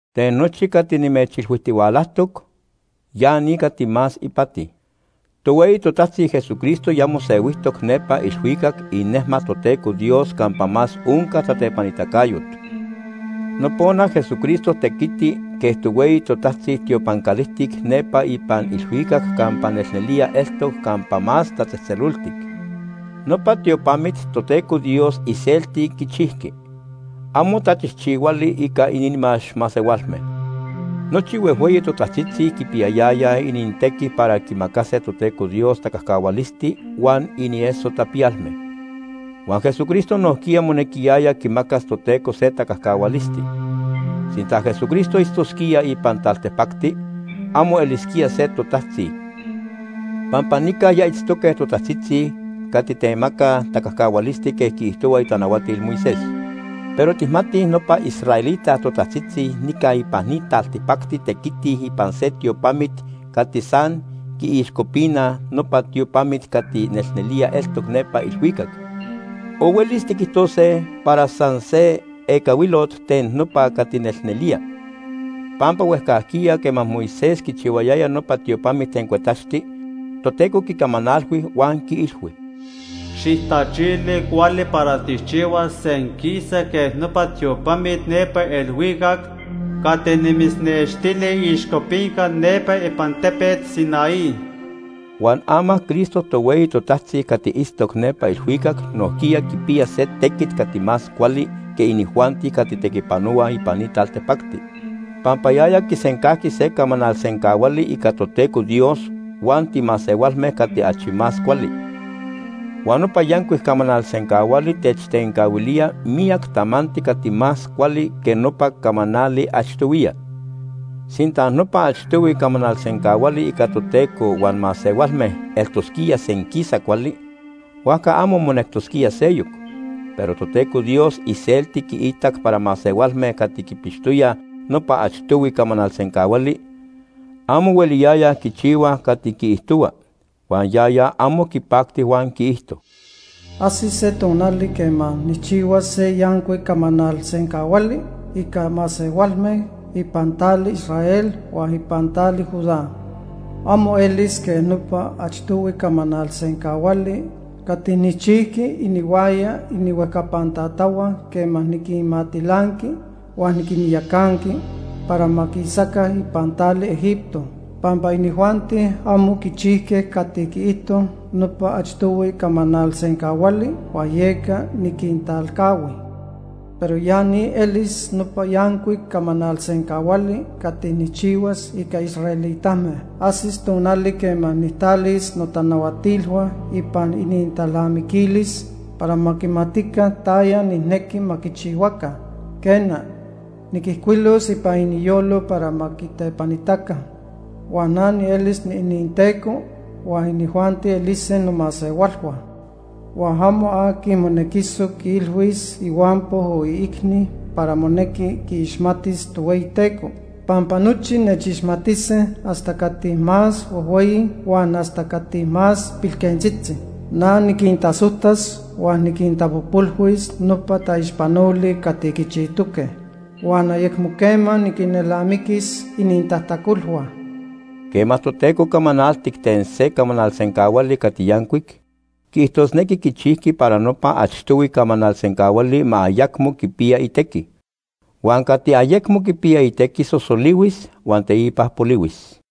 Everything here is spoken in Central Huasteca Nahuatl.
Ten nochi cati nimechilhuijtihualajtoc, ya ni cati más ipati: Tohueyi totajtzi Jesucristo ya mosehuijtoc nepa ilhuicac inejmat Toteco Dios campa más onca tatepanitacayot. Nopona Jesucristo tequiti quej tohueyi totajtzi tiopan calijtic nepa ipan ilhuicac campa nelnelía eltoc Campa Más Tatzejtzeloltic. Nopa tiopamit Toteco Dios iselti quichijqui. Amo tachijchihuali ica inimax masehualme. Nochi huejhueyi totajtzitzi quipiyayayaj inintequi para quimacase Toteco Dios tacajcahualisti huan inieso tapiyalme. Huan Jesucristo nojquiya monequiyaya quimacas Toteco se tacajcahualisti. Sinta Jesucristo itztosquía ipan taltipacti, amo elisquía se totajtzi, pampa nica ya itztoque totajtzitzi cati temacaj tacajcahualisti quej quiijtohuaj itanahuatil Moisés. Pero tijmatij nopa israelita totajtzitzi nica ipan ni taltipacti tequitij ipan se tiopamit cati san quiixcopinaj nopa tiopamit cati nelnelía eltoc nepa ilhuicac, o huelis tiquijtose para san se ecahuilot ten nopa cati nelnelía. Pampa huejcajquiya quema Moisés quichihuayaya nopa tiopamit ten cuetaxti, Toteco quicamanalhui huan quiilhui: “Xijtachili cuali para tijchihuas senquisa quej nopa tiopamit nepa ilhuicac cati nimitznextili iixcopinca nepa ipan tepet Sinaí.” Huan ama Cristo tohueyi totajtzi cati itztoc nepa ilhuicac nojquiya quipiya se tequit cati más cuali que inijuanti cati tequipanohuaj ipan ni taltipacti, pampa yaya quisencajqui se camanal sencahuali ica Toteco Dios huan timasehualme cati achi más cuali. Huan nopa yancuic camanal sencahuali techtencahuilía miyac tamanti cati más cuali que nopa camanali achtohuiya. Sinta nopa achtohui camanal sencahuali ica Toteco huan masehualme eltosquía senquisa cuali, huajca amo monectosquía seyoc. Pero Toteco Dios iselti quiitac para masehualme cati quipixtoyaj nopa achtohui camanal sencahuali, amo hueliyayaj quichihuaj cati quiijtohua, huan yaya amo quipacti huan quiijto: “Ajsis se tonali quema nijchihuas se yancuic camanal sencahuali ica masehualme ipan tali Israel huan ipan tali Judá. Amo elis quej nopa achtohui camanal sencahuali cati nijchijqui inihuaya inihuejcapan tatahua quema niquinmatilanqui huan niquinyacanqui para ma quisaca ipan tali Egipto. Pampa inijuanti amo quichijque cati quiijto nopa achtohui camanal sencahuali huan yeca niquintalcahui. Pero ya ni elis nopa yancuic camanal sencahuali cati nijchihuas ica israelitame. Ajsis tonali quema nijtalis notanahuatilhua ipan inintalnamiquilis para ma quimatica taya nijnequi ma quichihuaca. Quena, niquijcuilos ipan iniyolo para ma quitepanitaca. Huan na nielis niininTeco huan inijuanti elise nomasehualhua. Huan amo aqui monequisoc quiilhuis ihuampo o iicni para monequi quiixmatis Tohueyiteco, pampa nochi nechixmatise hasta cati más huejhueyi huan hasta cati más pilquentzitzi. Na niquintasojtas huan niquintapojpolhuis nopa taixpanoli cati quichijtoque, huan ayecmo quema niquelnamiquis inintajtacolhua.” Quema Toteco camanaltic ten se camanal sencahuali cati yancuic, quiijtosnequi quichijqui para nopa achtohui camanal sencahuali ma ayecmo quipiya itequi. Huan cati ayecmo quipiya itequi sosolihuis huan teipa polihuis.